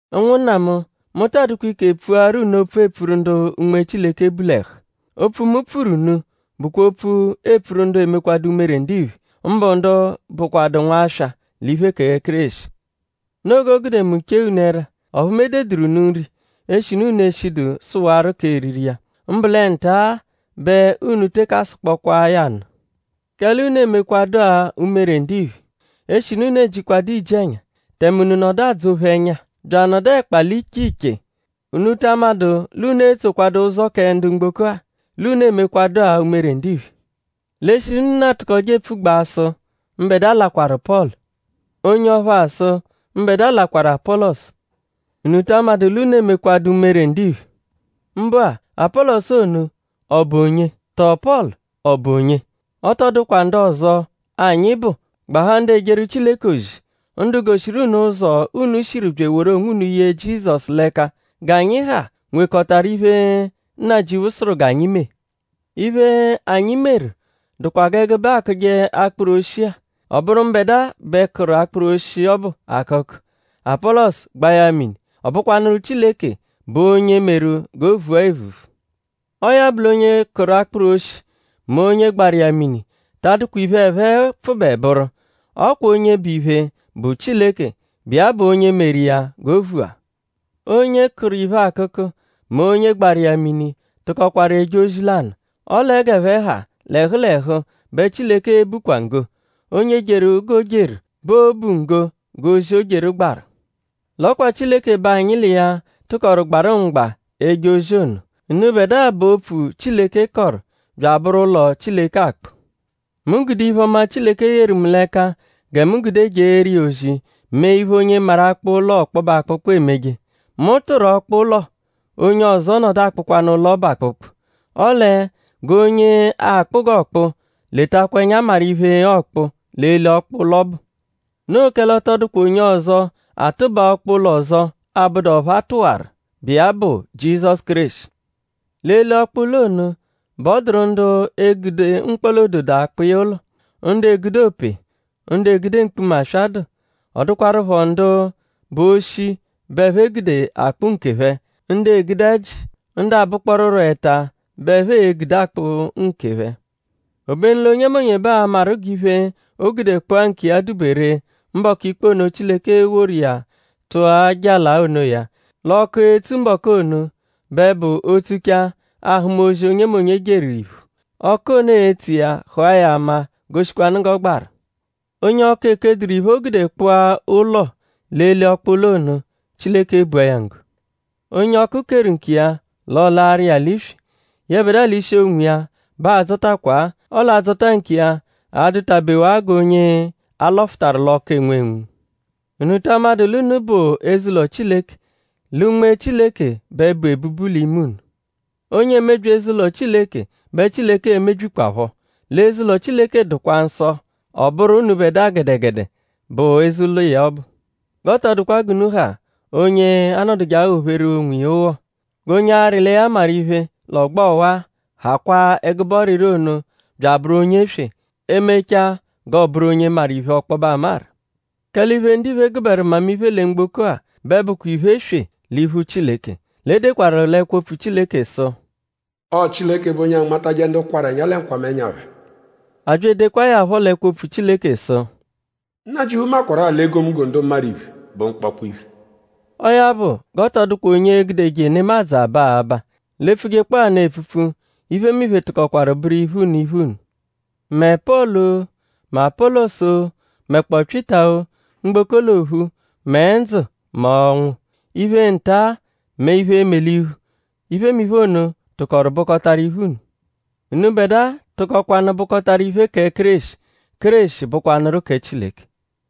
Ụnwunna mu; mu ta adụkwa ike pfuaru unu opfu, eepfuru ndu Unme Chileke bu l'ẹhu. Opfu, mu pfuru unu bụkwa opfu, eepfuru ndu emekwadu umere ndiphe; mbụ ndu bụkwadu nwaswa l'iphe kẹ Kéreshi. Noo g'o gude mu chee unu ẹra; ọphu mu ededụru unu nri eshinu unu eshidu sụwaru k'eriri iya. Mbụ lẹ nta-a bẹ unu teke asụkpokwaa ya nụ; kẹle unu emekwadụa umere ndiphe. Eshinu unu ejikwadu iji-ẹnya; tẹme unu nọdu adzọ-phe ẹnya; bya anọdu ẹkpa l'iche iche;?unu ta amadụ l'unu etsokwadu ụzo kẹ ndu mgboko-a; l'unu emekwadua umere ndiphe. L'eshinu unu atụkoje epfugbaa sụ: “Mbẹdua lakwaru Pọlu.” Onye ọphu asụ: “Mbẹdua lakwaru Apọlosu.”?Unu ta amadụ l'unu emekwadu umere ndiphe? Mbụ-a; Apọlosu ono;?ọ bụ onye? Tọo Pọlu;?ọ bụ onye? Ọ tọ dụkwa ndu ọzo, anyi bụ gbahaa ndu ejeru Chileke ozi; ndu goshiru unu ụzo, unu shiru bya eworu onwunu ye Jizọsu l'ẹka. G'anyi ha nwekọtaru iphe, Nnajịuphu sụru g'anyi mee. Iphe, anyi meru dụkwa g'ẹgube-a, aakụje akpụru oshi-a. Ọ bụru mbẹdua bẹ kụru akpụru oshi ọbu akụku; Apọlosu gbaa ya mini. Ọ bụkwanuru Chileke bụ onye meru g'o vua evuvu. Ọo ya bụ l'onye kụru akpụru oshi; mẹ onye gbaru iya mini ta adụkwa iphe, ẹphe pfụbe bụru. Ọ kwa onye bụ iphe bụ Chileke, bụ iya bụ onye meru iya g'o vua. Onye kụru iphe akụku mẹ onye gbaru iya mini tụkokwaru eje ozi lanụ. Ọle g'ẹphe ha l'ẹhu l'ẹhu bẹ Chileke e-bukwa nggo; onye jeru g'o jeru bẹ oo-bu nggo g'ozi, o jeru gbarụ. L'ọ kwa Chileke bẹ anyi l'iya tụkoru gbarụ mgba eje ozi ono. Unubẹdua bụ opfu, Chileke kọru bya abụru ụlo, Chileke akpụ. Mu gude iphe-ọma, Chileke yeru mu l'ẹka gẹ mu gude jeeru iya ozi mee iphe, onye maru akpụ ụlo ọkpobe akpụkpu emeje. Mu tụru ọkpa-ụlo; onye ọzo nọdu akpụkwanu ụlo ọbu akpụkpu. Ọle g'onye akpụ g'ọokpu; letakwa ẹnya maru iphe, ọokpu l'eli ọkpa-ụlo ọbu. Noo kẹle ọ tọ dụkwa onye ọzo, atụbaa ọkpa-ụlo ọzo abụdu ọphu a tụwaru, bụ iya bụ Jizọsu Kéreshi. L'eli ọkpa-ụlo ono bẹ ọ dụru ndu e-gude mkpọla-ododo akpụ iya ụlo; ndu egude ope; ndu egude mkpuma, aswa dụ; ọ dụkwarupho ndu bụ oshi bẹ ẹphe e-gude akpụ nkephẹ; ndu egude ẹji; ndu abụkpooruro ẹta bẹ ẹphe e-gude akpụ nkephẹ. Obenu l'onyemonye bẹ aa-maru g'iphe, o gude kpụa nkiya dụ-be ree mbọku ikpe ono, Chileke e-woru iya tụa jala onoya. L'ọku, e-tsu mbọku ono bẹ bụ o -tsuchaa; aa-hụma ozi, onyemonye jeru iphu. Ọku ono e-tsu iya hụa ya ama goshikwanụ g'ọ gbaru. Onye ọku ekeduru iphe, o gude kpụa ụlo l'eli ọkpa-ụlo ono; Chileke ebua ya nggo. Onye ọku keru nkiya; l'ọolaaru iya l'iswi; yẹbedua l'ishi onwiya b'aa-dzọtakwa-a; ọle adzọta nkiya a-dụtabewa g'onye a lọfutaru l'ọku enwunwu. ?Unu ta amadụ l'unu bụ eze-ụlo Chileke; lẹ Unme Chileke bẹ bu ebubu l'ime unu? Onye emebyi eze-ụlo Chileke bẹ Chileke e-mebyikwaphọ. L'eze-ụlo Chileke dụkwa nsọ; ọ bụru unubẹdua gẹdegede bụ eze-ụlo iya ọbu. G'ọ tọ dụkwa g'unu ha onye anọduje aghọ-pheru onwiya ụgho. G'onye arị lẹ ya maru iphe l'ọgbo ọwa-a; hakwaa ẹgube ọriri ono bya abụru onye-eswe; e -mechaa g'ọo-bụru onye maru iphe ọkpobe amaru. Kẹle iphe, ndiphe gụberu mmamiphe lẹ mgboko-a bẹ bụkwa iphe-eswe l'iphu Chileke. L'e dekwaru l'ẹkwo-opfu Chileke sụ: “Ọo Chileke bụ onye anmatajẹ ndu kwarụ ẹnya lẹ nkwamẹnya phẹ.” A bya edekwaa ya phọ l'ẹkwo-opfu Chileke sụ: “Nnajịuphu makwarụ-a l'egomunggo ndu maru iphe bụ mkpọkpo iphe.” Ọo ya bụ; g'ọ tọ dụkwa onye e-gudeje nemadzụ aba abaa. L'e -pfujekpọo ya nụ epfupfu; iphemiphe tụkokwaru bụru iphe unu iphe unu; mẹ Pọlu-o; mẹ Apọlosu-o; mẹkpoo Pyịta-o; mgboko l'ophu; mẹ ndzụ mẹ ọnwu. Iphe nta-a mẹ iphe e-me l'iphu; iphemiphe ono tụkoru bụkotaru iphe unu. Unubẹdua tụkokwanu bụkotaru iphe kẹ Kéreshi; Kéreshi bụkwanuru kẹ Chileke.